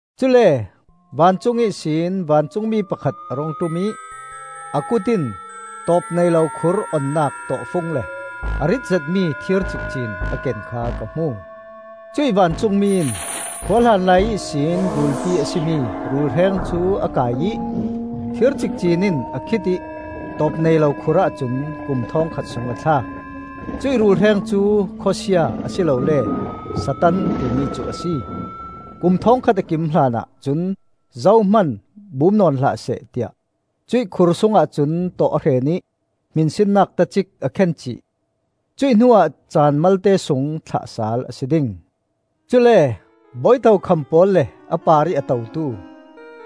Cule vancung ihsin vancungmi pakhat a rung ṭum ih a kut in tawpneilo khur onnak tawhfung le a rit zetmi thir cikcin a ken kha ka hmu. Cuih vancungmi in khua hlanlai ihsin rulpi a si mi rulhreng cu a kaih ih thir cikcin in a khit ih tawpneilo khur ahcun kum thawngkhat sung a thlak. Cuih rulhreng cu Khawsia a si lole Satan timi cu a si. Kum thawngkhat a kim hlanah cun zohman bum nawn hlah seh tiah cuih khur sungah cun tawh a hren ih hminsinnak tacik a khen cih. Cuih hnuah caan malte sung thlah sal a si ding. Cule bawi tokham pawl le a parih a totu,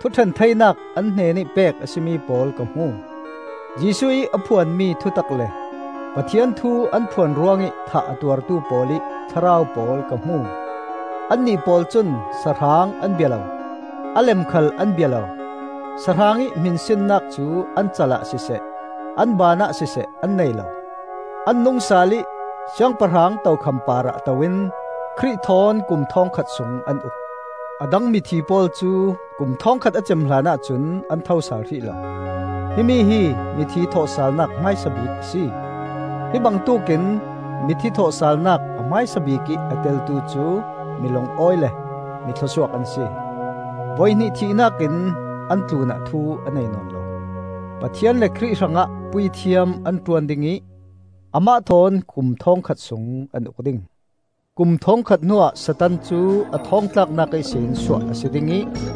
thuṭhen theinak an hnenih pek a si mi pawl ka hmu. Jesuh ih a phuanmi thutak le Pathian thu an phuan ruangih thah a tuartu pawl ih thlarau pawl ka hmu. Annih pawl cun sahrang an bia lo, a lem khal an bia lo; sahrang ih hminsinnak cu an cal ah siseh an baan ah siseh an nei lo. An nung sal ih siangpahrang tokham parah to in Khrih thawn kum thawngkhat sung an uk. A dang mithi pawl cu kum thawngkhat a cem hlanah cun an thosal hrih lo. Himi hi mithi thawhsalnak hmaisa bik a si. Hi bangtuk in mithi thawhsalnak a hmaisa bikih a teltu cu mi lungawi le mi thluasuak an si. Voihnih thihnak in an tlunah thu a nei nawn lo. Pathian le Khrih hrangah puithiam an ṭuan ding ih amah thawn kum thawngkhat sung an uk ding. Kum thawngkhat hnuah Satan cu a thawng tlaknak ihsin suah a si ding ih,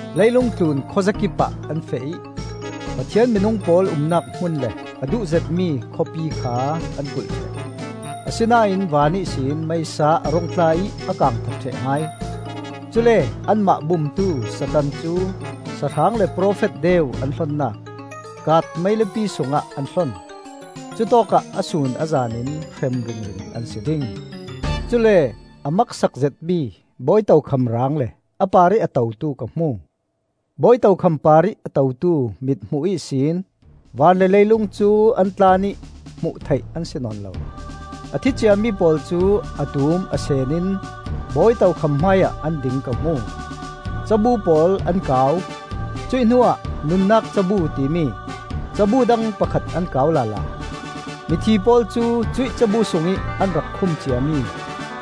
Leilung tlun khuazakipah an feh ih Pathian minung pawl umnak hmun le a duh zetmi khawpi kha an kulh ṭheh. Asinain van ihsin meisa a rung tla ih a kang that ṭheh hai. Cule anmah bumtu Satan cu sahrang le profet deu an hlonnak, kaat meilipi sungah an hlon. Cutawkah a sun a zanin hrem ringring an si ding. Cule a maksak zetmi bawi tokham raang le a parih a totu ka hmu. Bawi tokham parih a totu mithmuh ihsin van le leilung cu an tlan ih hmuh theih an si nawn lo. A thi ciami pawl cu a tum a sen in bawi tokham hmaiah an ding ka hmu. Cabu pawl an kau; cuih hnuah nunnak cabu timi cabu dang pakhat an kau lala. Mithi pawl cu cuih cabu sungih an rak khum ciami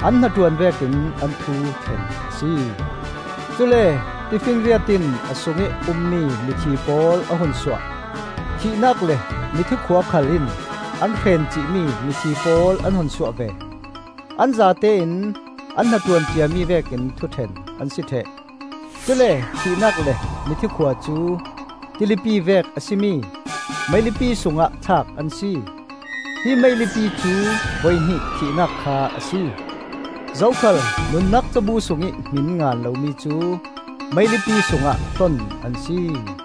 an hnaṭuan vekin an thu ṭhen a si. Cule tifinriat in a sungih ummi mithi pawl a hun suah. Thihnak le mithi khua khal in an hren cihmi mithi pawl an hun suah ve. An zatein an hnaṭuan ciami vekin thuṭhen an si ṭheh. Cule thihnak le mithi khua cu tilipi vek a si mi meilipi sungah thlak an si. Hi meilipi cu voihnih thihnak kha a si. Zokhal nunnak cabu sungih hmin ngan lomi cu meilipi sungah hlon an si.